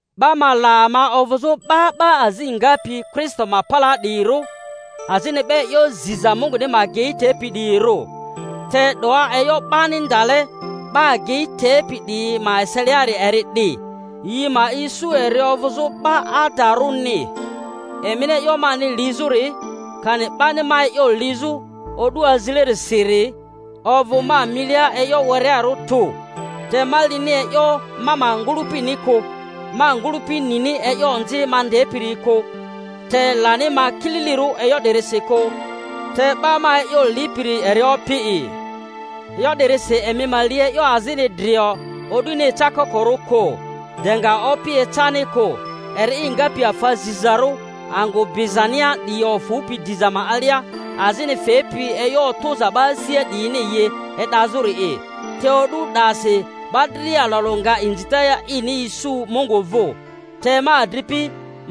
'Ba ma la ama ovᴜzᴜ 'ba 'ba azi ngapi Kristo ma palaa 'diyirᴜ, azini 'ba e'yo ziza Munguni ma agei tepi 'diyirᴜ. Te 'doa, e'yo 'bani ndale 'ba agei tepi 'diyi ma eseliari eri 'di, yi ma isu eri ovᴜzᴜ 'ba adarᴜ-ni. Emini e'yo mani lizᴜri, kani 'bani ma e'yo lizᴜ o'du azilerisiri, ovᴜ ma milia e'yo werearᴜ tᴜ. Te ma lini e'yo ma ma ngᴜlᴜpini kᴜ. Ma ngᴜlᴜpi nini e'yo onzi ma ndepiri kᴜ, te lani ma kililirᴜ e'yo 'dirisi kᴜ; te 'ba ma e'yo lipiri eri Opi'i. E'yo 'dirisi emi ma li e'yo azini drio o'duni ecakokorᴜ kᴜ, de nga Opi ecani kᴜ, eri'i ngapi afa zizarᴜ angᴜ bizania 'diyi ofᴜpi diza ma alia, azini fepi e'yo otᴜza 'ba asia 'diyini yi e'dazᴜri'i. Te o'du 'dasi 'ba dria alᴜ alᴜ nga inzita ini isu Mungu vᴜ. Te, ma adripi,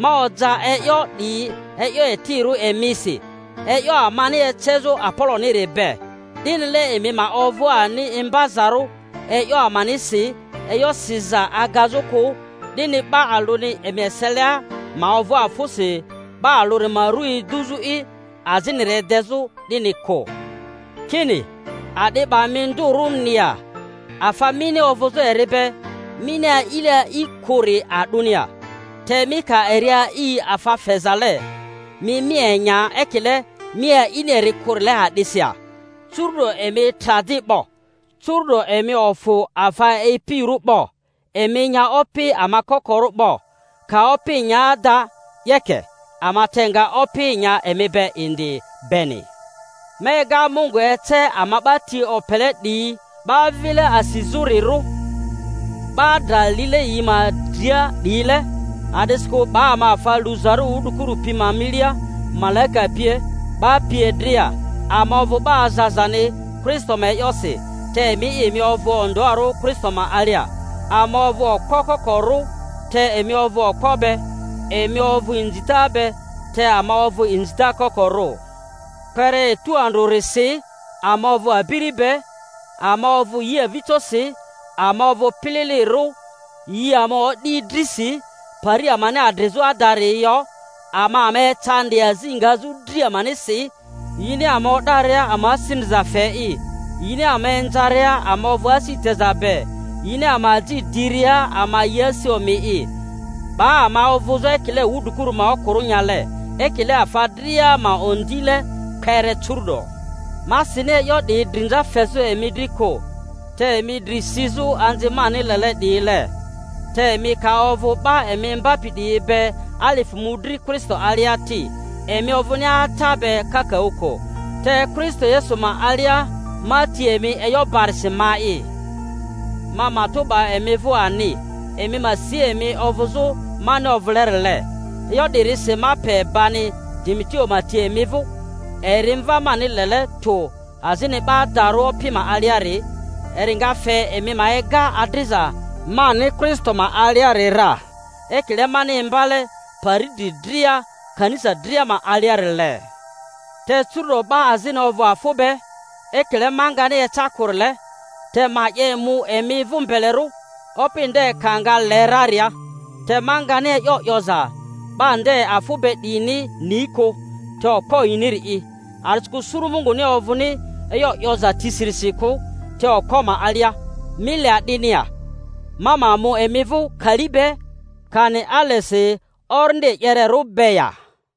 ma oja e'yo 'diyi e'yo etirᴜ emisi, e'yo amani ecezᴜ Apoloniri be, 'dinile emi ma ovᴜ ani imbazarᴜ e'yo amanisi e'yo siza agazᴜ kᴜ, 'dini 'ba alᴜni emi eselia ma ovᴜ afᴜsi 'ba alᴜri ma ru eduzᴜ'i, aziniri edezᴜ, 'dini kᴜ. Kini, A'di 'ba mi ndᴜrᴜni ya? Afa mini ovᴜzᴜ eri be mini a'ile a'i kᴜri a'dᴜni ya? Te mi ka eri a'i afa fezale, mi mi enya ekile mi a'ini eri kᴜrile a'disi ya? Curu'do emi tra di 'bo! Curu'do emi ofᴜ afa e'ipirᴜ 'bo! Emi nya opi ama kokorᴜ 'bo! Ka opi nya ada, 'yeke, ama te nga opi nya emi be indi beni! Ma ega Mungu ece ama 'ba ti opele 'diyi 'ba vile asizᴜrirᴜ, 'ba dra lile yi ma dria 'diyile; a'disikᴜ 'ba ama afa luzarᴜ wudrikuru pi ma milia, malaika pie, 'ba pie dria. Ama ovᴜ 'ba azazani Kristo ma e'yosi, te emi'i, emi ovᴜ ondᴜarᴜ Kristo ma alia. Ama ovᴜ okpo koko-rᴜ, te emi ovᴜ okpo be. Emi ovᴜ inzita be, te ama ovᴜ inzita kokorᴜ. Kpere etu andrᴜrisi ama ovᴜ abiri be, ama ovᴜ yi avijosi, ama ovᴜ pililirᴜ, yi ama odi drisi, pari amani adrizᴜ adari yo, ama ama ecandi, azi ngazᴜ dri amanisi. Yini ama o'daria ama asi ndriza fe'i; yini ama inzaria ama ovᴜ asi teza be; yini ama aji diria ama yi asi omi'i; 'ba ama ovᴜzᴜ ekile wudrikuru ma okᴜrᴜ-nyale, ekile afa dria ma ondile, kpere curᴜ'do. Ma sini e'yo 'diyi drinza fezᴜ emi dri kᴜ, te emi dri sizᴜ anzi mani lele 'diyile. Te emi ka ovᴜ 'ba emi imbapi 'diyi be alifᴜ mᴜdri Kristo alia ti, emi ovᴜni ata be kakaᴜ kᴜ. Te Kristo Yesu ma alia ma ti emi e'yo barisi ma'i. Ma matᴜ 'ba emi vᴜ ani, emi ma si emi ovᴜzᴜ mani ovᴜlerile. E'yo 'di-risi ma pe bani Timoteo ma ti emi vᴜ, eri mva mani lele tᴜ azini 'ba adarᴜ Opi ma aliari, eri nga fe emi ma ega adriza mani Kristo ma aliari ra, ekile mani imbale pari dri dria kanisa dria ma aliarile. Te curᴜ'do 'ba azini ovᴜ afᴜ be, ekile ma ngani eca kᴜrile. Te ma 'ye mu emi vᴜ mbelerᴜ, Opi nde ka nga le raria, te ma ngani e'yo 'yoza 'ba nde afᴜ be 'diyini ni kᴜ, te okpo yiniri'i. A'disikᴜ suru Munguni ovᴜni e'yo 'yoza tisirisi kᴜ, te okpo ma alia. Mi le a'dini ya? Ma ma mu emi vᴜ kali be, kani alesi orindi e'yererᴜ be ya?